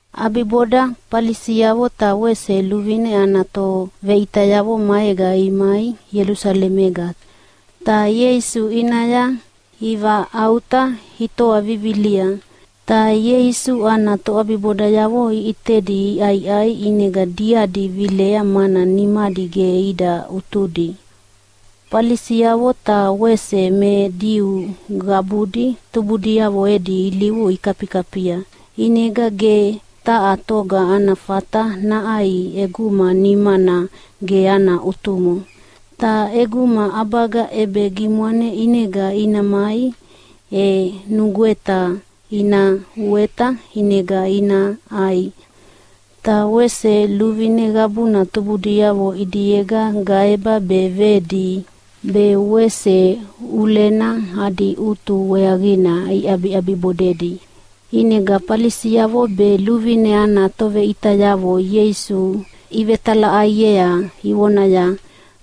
ʼAbiboda Falisiavo ta wese luvine ana toveʼitayavo maega imai Ielusalemega, ta Ieisu ʼinaya ivaʼauta itoa vivilia. Ta Ieisu ana toʼabibodayavo iʼitedi iʼaiʼai, ʼinega diadi vilea mana nimadi ge ida ʼutudi. (Falisiavo ta wese me Diu qabudi tubudiavo edi ilivu ikafikafia. ʼInega ge taha toga ana fata naʼai ʼeguma nimana ge ana ʼutumo. Ta ʼeguma ʼabaga ʼebegimwane ʼinega ina mai, e nugweta ina uweta ʼinega ina ʼai. Ta wese luvine qabuna tubudiavo ʼidiega gaeba be vedi be wese ʼulena adi ʼutu weaqina iʼabiʼabibodedi.) ʼInega Falisiavo be luvine ana toveʼitayavo Ieisu ivetalaʼaiea ivonaya,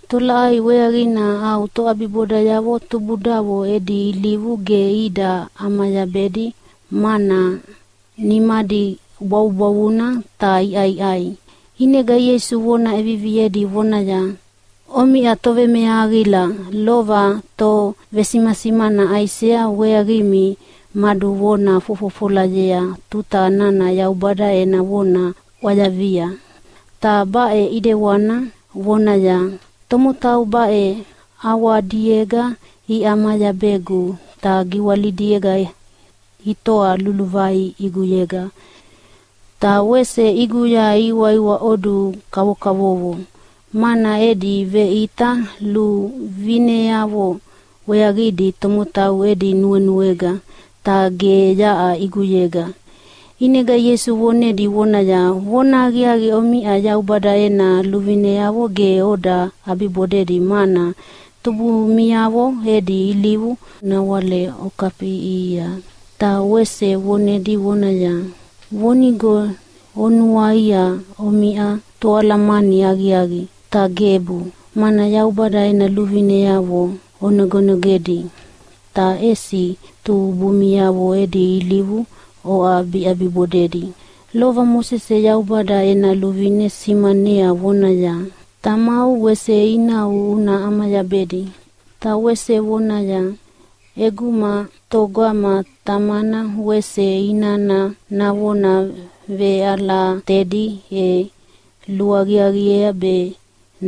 “Tolaʼai weaqina au toʼabibodayavo tubudavo edi ilivu ge ida ʼamayabedi, mana nimadi bwavubwavuna ta iʼaiʼai?” ʼInega Ieisu vona ʼeviviedi vonaya, “Omiʼa tovemeahaqila! Lova tovesimasimana Aisea weaqimi maduvona fofofolayea tuta nana Yaubada ena vona ʼwayavia, ta baʼe ʼidewana vonaya, ‘Tomotau baʼe ʼawadiega iʼamayabegu, ta giwalidiega itoa luluvai ʼiguyega. Ta wese ʼiguya ihiwaiwaʼodu kavokavovo, mana edi veʼita luvineavo weaqina tomotau edi nuenuega, ta ge yaʼa ʼiguyega.’” ʼInega Ieisu vonedi vonaya, “Vonahaqiaqi, omiʼa Yaubada ena luvineavo ge oda ʼabibodedi, mana tubumiavo edi ilivu nawale okafiʼiʼihia.” Ta wese vonedi vonaya, “Vonigo onuaia omiʼa toalamani aqiaqi, ta gebu! Mana Yaubada ena luvineavo onogenogedi, ta ʼesi tubumiavo edi ilivu oʼabiʼabibodedi. Lova Mosese Yaubada ena luvine simanea vonaya, ‘Tamau wese inau una ʼamayabedi.’ Ta wese vonaya, ‘ʼEguma togama tamana wese inana navona veʼalatedi e luaqiaqiea be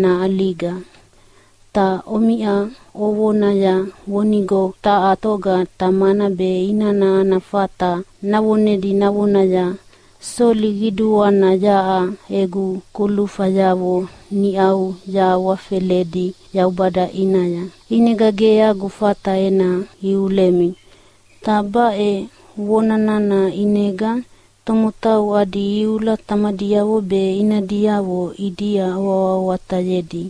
naʼaliga.’ Ta omiʼa ovonaya vonigo taha toga tamana be inana ana fata navonedi navonaya, ‘Soli qiduana, yaʼa egu kulufayavo niʼau yahawafeledi Yaubada ʼinaya, ʼinega ge agu fata ena iulemi.’ Ta baʼe vona nana ʼinega tomotau adi iula tamadiavo be inadiavo ʼidia oawahawatayedi.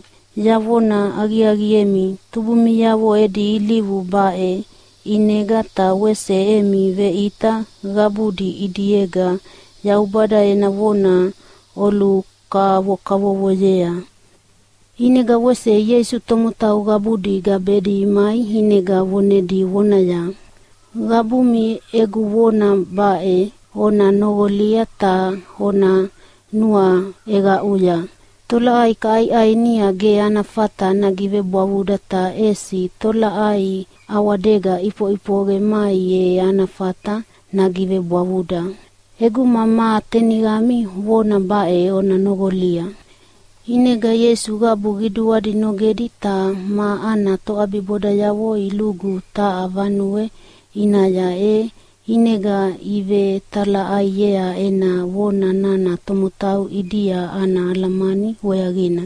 Yavona aqiaqiemi, tubumiavo edi ilivu baʼe ʼinega ta wese emi veʼita qabudi ʼidiega Yaubada ena vona olukavokavovoyea.” ʼInega wese Ieisu tomotau qabudi gabedi imai ʼinega vonedi vonaya, “Qabumi egu vona baʼe ona noqolia ta ona nuaʼeqaʼuya! Tolaʼai kaʼaiʼainia ge ana fata nagivebwavuda. Ta ʼesi tolaʼai ʼawadega ʼifoʼifoqe mai e ana fata nagivebwavuda.” [“ʼEguma ma teniqami vona baʼe ona noqolia!”] ʼInega Ieisu qabu qiduadi nogedi ta ma ana toʼabibodayavo ilugu taha vanue ʼinaya, e ʼinega ivetalaʼaiea ena vona nana tomotau ʼidia ana alamani weaqina.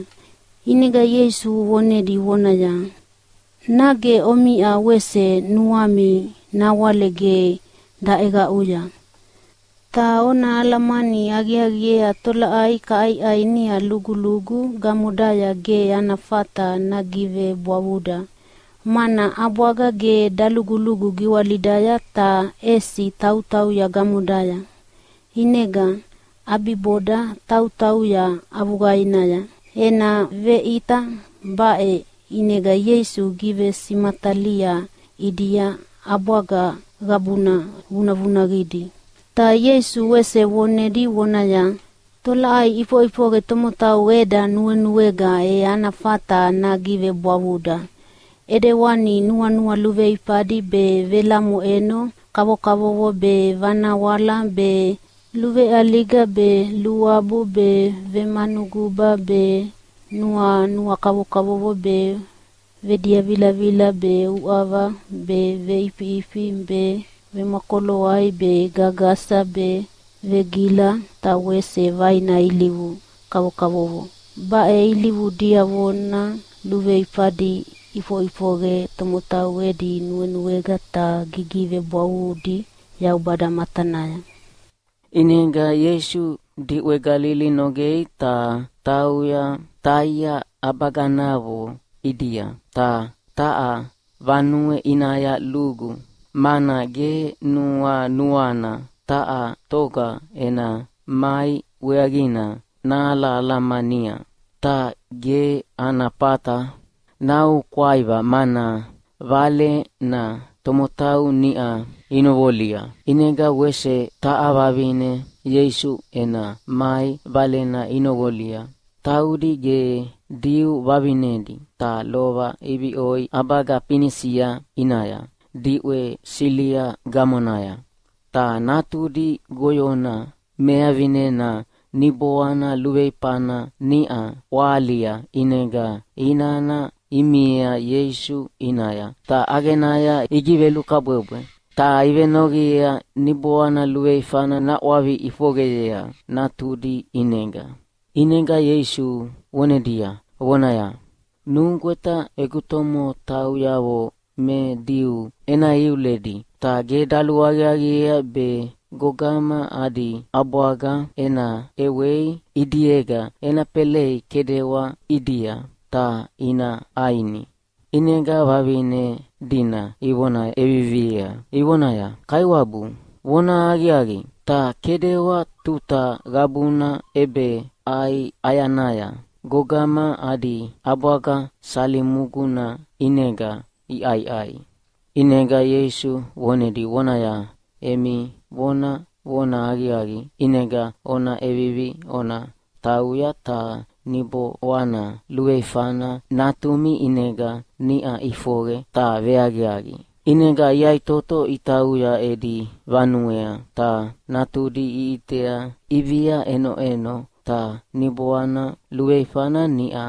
ʼInega Ieisu vonedi vonaya, “Nage omiʼa wese nuami nawale ge daʼeqaʼuya? Ta ona alamani aqiaqiea tolaʼai kaʼaiʼainia lugulugu gamodaya ge ana fata nagivebwavuda. Mana ʼabwaga ge dalugulugu giwalidaya, ta ʼesi tautauya gamodaya, ʼinega ʼabiboda tautauya avuqainaya.” (Ena veʼita baʼe ʼinega Ieisu givesimatalia ʼidia ʼabwaga qabuna vunavunaqidi.) Ta Ieisu wese vonedi vonaya, “Tolaʼai ʼifoʼifoqe tomotau eda nuenuega e ana fata nagivebwavuda, ʼedewani nuanua luveifadi be, velamoʼeno kavokavovo be, vanawala be, luveʼaliga be, luabu be, vemanuguba be, nuanua kavokavovo be, vediavilavila be, uʼava be, veʼifiʼifi be, vemwakoloai be, gagasa be, vegila ta wese vaina ilivu kavokavovo. Baʼe ilivu diavona luveifadi iʼifoʼifoqe tomotau edi nuenuega ta gigivebwavudi Yaubada matanaya.” ʼInega Ieisu diʼwe Galili nogea ta tauya Taia ʼabaganavo ʼidia. Ta taha vanue ʼinaya lugu, mana ge nuanuana taha toga ena mai weaqina nahalamania. Ta ge ana fata naoukwaiva mana valena tomotau niʼa inoqolia. ʼInega wese taha vavine Ieisu ena mai valena inoqolia. Taudi ge Diu vavinedi, ta lova iviʼoi ʼabaga Finisia ʼinaya diʼwe Silia gamonaya. Ta natudi goyona mevavinena niboana luveifana niʼa ʼwahalia, ʼinega inana imai Ieisu ʼinaya ta ʼaqenaya igivelukabwebwe. Ta ivenoqiea niboana luveifana naʼwavi ʼifoqeyea natudi ʼinega. ʼInega Ieisu vonedi vonaya, “Nugweta egu tomotauyavo me Diu ena iuledi. Ta ge daluaqiaqiea be gogama adi ʼabwaga ena ʼewei ʼidiega ena felei kedewa ʼidia ta ina ʼaini.” ʼInega vavine dina ivona ʼeviviea ivonaya, “Kaiwabu vonahaqiaqi, ta kedewa tuta qabuna ʼebeʼai ʼayanaya gogama adi ʼabwaga salimuguna ʼinega iʼaiʼai.” ʼInega Ieisu vonedi vonaya, “Emi vona vonahaqiaqi, ʼinega ona ʼevivi ona tauya ta niboana luveifana natumi ʼinega niʼa ʼifoqe ta veaqiaqi.” ʼInega iyaʼitoto itauya edi vanuea ta natudi iʼitea ʼivia ʼenoʼeno. Ta niboana luveifana niʼa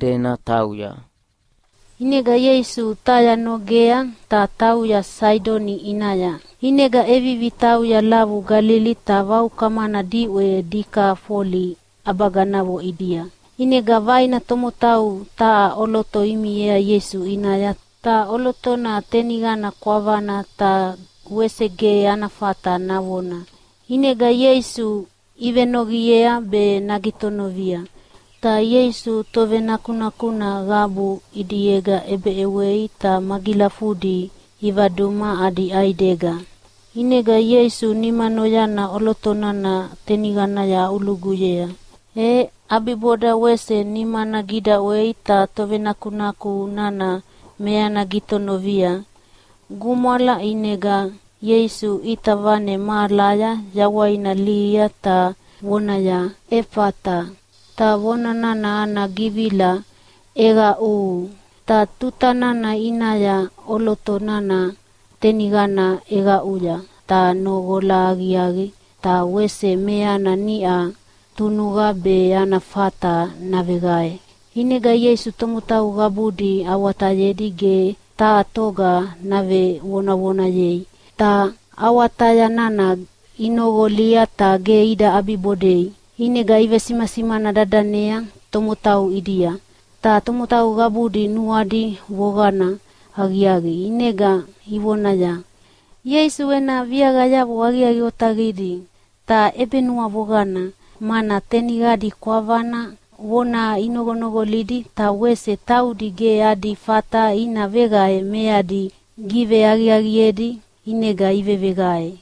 dena tauya. ʼInega Ieisu Taia nogea ta tauya Saidoni ʼinaya, ʼinega ʼevivi tauya lavu Galili ta vaukamana diʼwe Dikafoli ʼabaganavo ʼidia. ʼInega vaina tomotau taha ʼoloto imiea Ieisu ʼinaya. Ta ʼolotona teniqana kwavana ta wese ge ana fata navona. ʼInega Ieisu ivenoqiea be nagitonovia. Ta Ieisu tovenakunakuna qabu ʼidiega ʼebeʼewei ta magilafudi ivaduma adi ʼaidega. ʼInega Ieisu nimanoyana ʼoloto nana teniqanaya aʼuluguyea. E ʼabiboda wese nimana gidaʼwei ta tovenakunaku nana meana gitonovia. Gumwala, ʼinega Ieisu ʼita vane mahalaya yawaina lihia ta vonaya, “Efata!” (Ta vona nana ana givila “ʼEqaʼuhu!”) Ta tuta nana ʼinaya ʼoloto nana teniqana ʼeqaʼuya ta noqola aqiaqi, ta wese meana niʼa tunuqa be ana fata naveqae. ʼInega Ieisu tomotau qabudi awatayedi ge taha toga navevonavonayei. Ta awataya nana inoqolia ta ge ida ʼabibodei, ʼinega ivesimasimana dadanea tomotau ʼidia. Ta tomotau qabudi nuadi voqana aqiaqi, ʼinega ivonaya, “Ieisu ena viaqayavo aqiaqi otaqidi ta ʼebenuavoqana, mana teniqadi kwavana vona inoqonoqolia, ta wese taudi ge adi fata ina veqae meadi giveaqiaqiedi ʼinega iveveqae.”